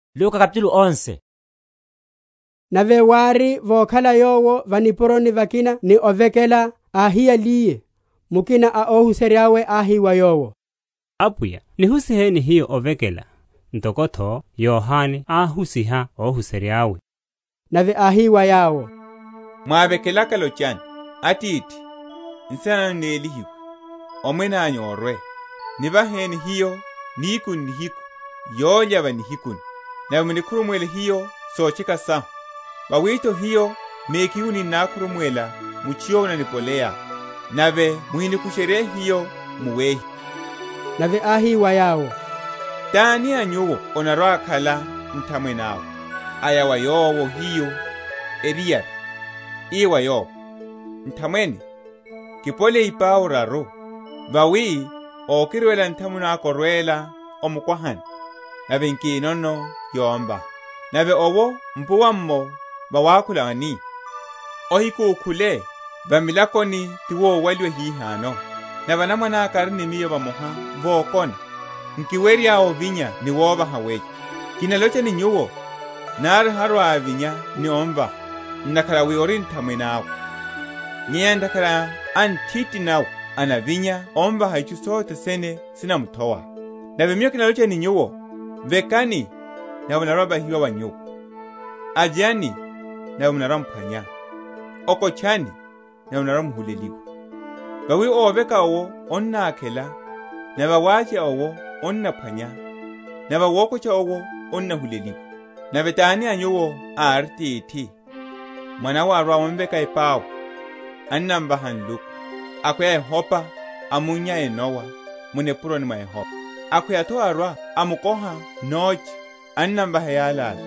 Nivekelo na Apwiya. Nave wári, vokhala Yowo va nipuroni vakina ni ovekela, áhiyaliye, mukina a óhuserya’we áhi wa Yowo, Apwiya, nihusiheni hiyo ovekela, ntoko’tho Yohane áhusiha óhuserya’we. Nave áhi wa yawo, Mwávekelaka lochani, Atithi, Nsina nanyu nélihiwe; Omwene anyu orwe; Nivaheni hiyo nihiku n’nihiku yólya ya va nihikuni. Nave munikhurumuwele hiyo sotcheka sahu; vawi’tho hiyo mekhihu ninnakhurumuwela mutchu yowo ananipoleya. Nave muhinikusherye hiyo mu wehiwa. Niphwanaphwaniho na nthamwene ótitelela. Nave áhi wa yawo, Tani a nyuwo anarwa‐akhala ni nthamwene awe, aya wa yowo ohiyu eriyari, ii wa yowo, Nthamwene, kipoleye ipau raru; vawi okirwela nthamwene aka órwela va mukwahani, nave nkinono yomvaha; nave owo a mpuwa’mmo vawakhula ani, Ohikukhule; va milakoni ti vowaliwa hihano, nave anamwane aka ari ni miyo vamoha vokona; nkiwerya ovinya ni wovaha weyo? Kinalocha ni nyuwo, nari harwa‐avinya ni omvaha, ntakhara wi ori nthamwene awe, nyenya ntakhara a nthiti nawe anavinya amvaha itchu sothe sene sinamuthowa. Nave Miyo kinalocha ni nyuwo, Vekani, nave onarwa‐ovahiwa wa nyuwo; avyani, nave munarwa‐m’phwanya; okotchani, nave munarwa‐muhuleliwa. Vawi óveka owo annákhela; nave awavya owo annaphwanya; nave awokotcha owo annahuleliwa. Nave tani a nyuwo ari atithi, mwanawe arwa‐amveka epau, anamvaha nluku? akhweya ehopa, amunnya enowa mu nipuroni mwa ehopa? akhweya’tho arwa‐amkoha noche anamvaha eyalala?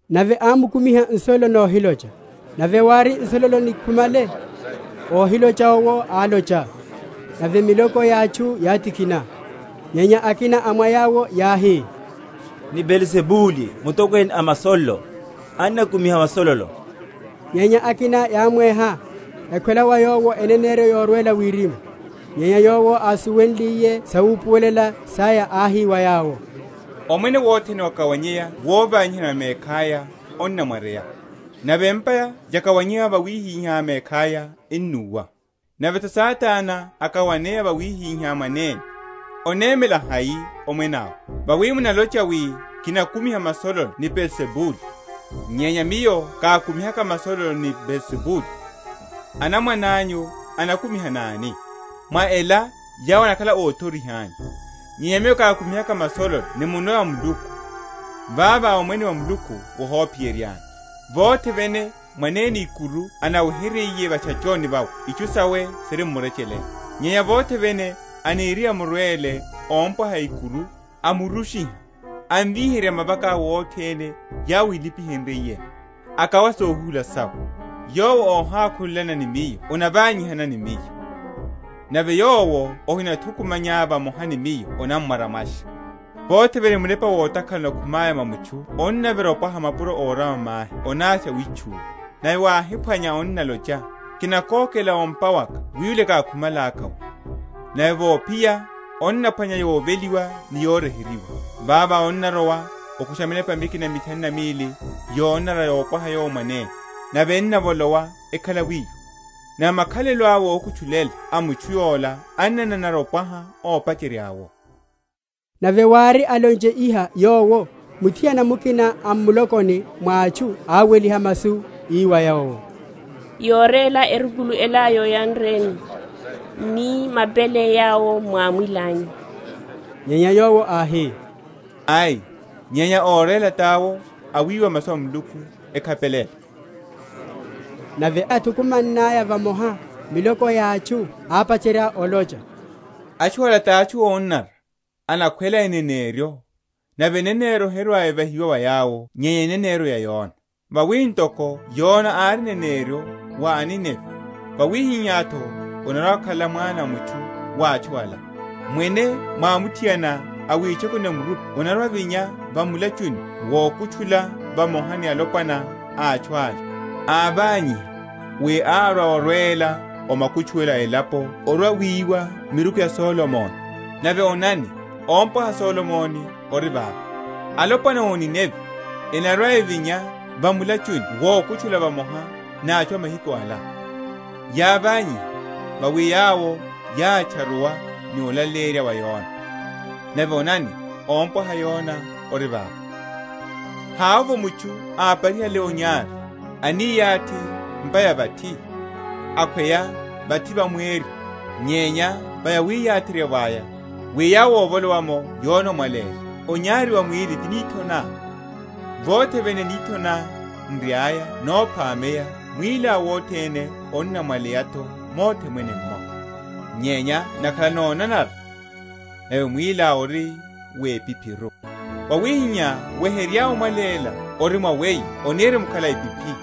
Nave ámkumiha nsololo nohilocha. Nave wári, nsololo nikhumale, óhilocha owo álocha; nave miloko ya atchu yátikhina. Nyenya akina a mwa yawo yáhi, Ni Beelzibuli mutokwene a masololo, anakumiha masololo. Nyenya akina yámweha, ekhwela wa Yowo eneneryo yorwela wirimu. Nyenya Yowo, ásuwenliye sawupuwelela saya, áhi wa yawo, Omwene wothene wokawaneya vovanyihana va mekhaya onamwaryeya; nave empa yakawaneya wivanyiha mekhaya enúwa. Nave’tho Satana akawaneya wivanyiha mwanene, onemela hai omwene awe? vawi munalocha wi kinakumiha masololo ni Beelzibuli. Nyenya Miyo kákumihaka masololo ni Beelzibuli, anamwane anyu enakumiha náni? Mwa ela yawo enakhala óthoriha anyu. Nyenya Miyo kákumihaka masololo ni munwe wa Muluku, vavo omwene wa Muluku wohophiyeryani. Vothe vene mwanene ikuru anaweheryiye va’tchachoni vawe itchu sawe siri m’murecheleni; nyenya vothe vene aniriye amurwele ómpwaha ikuru, amurushiha, anamvíherya mavaka’we othene yawo ílipihenryiyeno, akawa sohuhula sawe. Yowo óhakhulelana ni Miyo anavanyihana ni Miyo; nave yowo óhithukumanya vamoha ni Miyo annamwaramwasha. Vothe vene munepa wotakhala onakhumaya mwa mutchu onnavira opwaha mapuro órama mahi onavya witchuwa; nave wáhi?-?phwanya onnalocha, Kinakokela o’mpa waka wiwile kákhumalaka’wo; nave vophiya, onnaphwanya yoveliwa ni yoryeheryiwa. Vavo onnarowa okusha minepa mikina mithanu na mili yonanara yompwaha yowo mwanene; nave ennavolowa ekhala wiwo; nave makhalelo awe ókutchulela a mutchu’la ennananara opwaha ópacherya’wo. Nave wári, alonche iha Yowo, muthiana mukina a m’mulokoni mwa atchu áweliha masu, ii wa Yowo, Yóréla erukulu ela yóyanreni, ni mapele yawo mwámwilanyu. Nyenya Yowo áhi, Ai, nyenya óréla tawo awiwa masu a Muluku ekhapelela. Eneneryo ya Yona. Nave yáthukumannaya vamoha miloko ya atchu, ápacherya olocha, Atchu ala tachu ónanara; enakhwela eneneryo, nave eneneryo herwa‐evahiwa wa yawo nyenya eneneryo ya Yona. Vawi ntoko Yona ári eneneryo wa aNinevi, wawihihá’tho anarwa‐akhala Mwana a mutchu wa atchu ala. Mwene mwamuthiana a witchekuni ya murupi anarwa‐avinya va mulachuni wokutchula vamoha ni alopwana a atchu ala, áványiha; wi árwa orwela o makutchuwelo a elapo orwa‐wiwa miruku ya Solomoni; nave onani, ómpwaha Solomoni ori vava. Alopwana a o Ninevi enarwa‐evinya va mulachuni wokutchula vamoha ni atchu a mahiku ala, yáványiha; vawi yawo yátcharuwa ni olaleyerya wa Yona; nave onani ómpwaha Yona ori vava. Onyari wa mwili. Havovo mutchu, aparihale onyari, aniyathi m’pa ya vathi, akhweya vathi va mweryo, nyenya va yawiyatheryavo aya, wi yawo óvolowa’mo yone omwaléla. Onyari wa mwíli ti nitho ná: vothe vene nitho ná n’riaya nophameya mwíliá wothene onamwaléla’tho mothe mwene’mmo; nyenya nakhala nonanara, nave mwíliá ori wepiphiru. Wawihihá weherya omwaléla ori mwa weyo onirimkhala epiphi.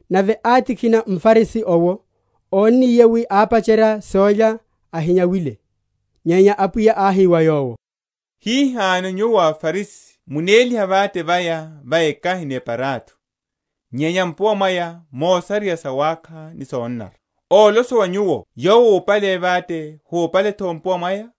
Nave átikhina mFarisi owo, ónniye wi ápacherya sólya ahinyawile. Nyenya Apwiya áhi wa yowo, Hihano nyuwo aFarisi munéliha vate vaya va ekahi ni eparatho, nyenya mpuwa mwaya munasareya sawákha ni sonanara. Ólosowa nyuwo Yowo úpale vate húpale’tho mpuwa mwaya?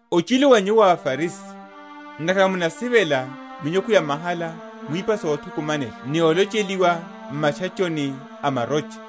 Ochilu wa nyuwo, aFarisi! ntakhara munasivela minyukhu yamahala mu ipa sothukumanela ni olocheliwa m’matchachoni a marocha.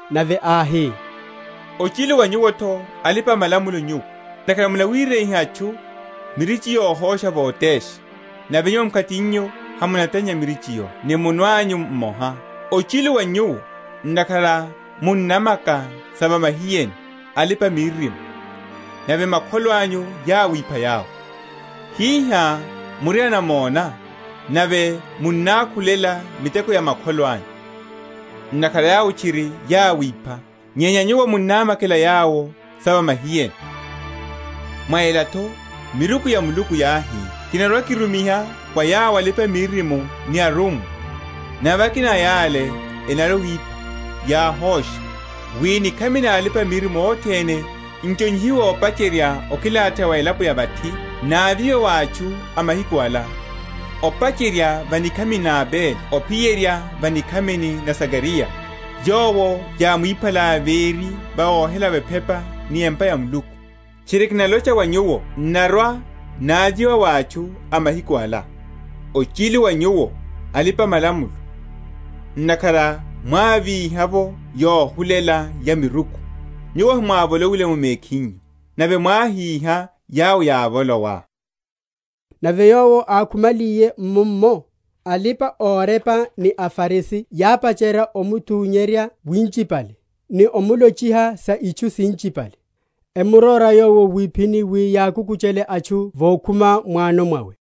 Nave áhi, Ochilu wa nyuwo’tho, alipa‐malamulo nyuwo! ntakhara munawireyiha atchu mirichi yohosha votesha, nave nyuwo mkhatinyu hamunatannya mirichi’yo ni munwe anyu mmoha. Ochilu wa nyuwo! ntakhara munnamaka sa va mahiyeni a alipa‐miririmo, nave makholo anyu yáwipha yawo. Hihá muri anamona, nave munnákhulela miteko ya makholo anyu; ntakhara yawo tchiri yáwipha, nyenya nyuwo munnámakela yawo sa va mahiyeni. Mwa ela’tho miruku ya Muluku yáhi, Kinarwa‐kirumiha wa yawo alipa‐miririmo ni arummwa; nave akina a yale enarwa‐ewipha, yáhosha; wi nikhami na alipa‐miririmo othene, n’chonyihiwe opacherya okilatheya wa elapo ya vathi navyiwe wa atchu a mahiku ala; opacherya va nikhamini na Abele ophiyerya va nikhamini na Zakariya, yowo yámwiphalaya véri vohelavo ephepa ni empa ya Muluku. Tchiri, kinalocha wa nyuwo n’narwa‐navyiwa wa atchu a mahiku ala. Ochilu wa nyuwo, alipa‐malamulo! ntakhara mwávíha’vo yohulela ya miruku; nyuwo hemwávolowile’mo mekhinyu, nave mwáhíha yawo yávolowa. Nave Yowo ákhumaliye mummo, alipa‐orepa ni aFarisi yápacherya omutunyerya winchipale, ni omulochiha sa itchu sinchipale; emuróra Yowo wiphini wi yakukuchele etchu yokhuma m’wano mwawe.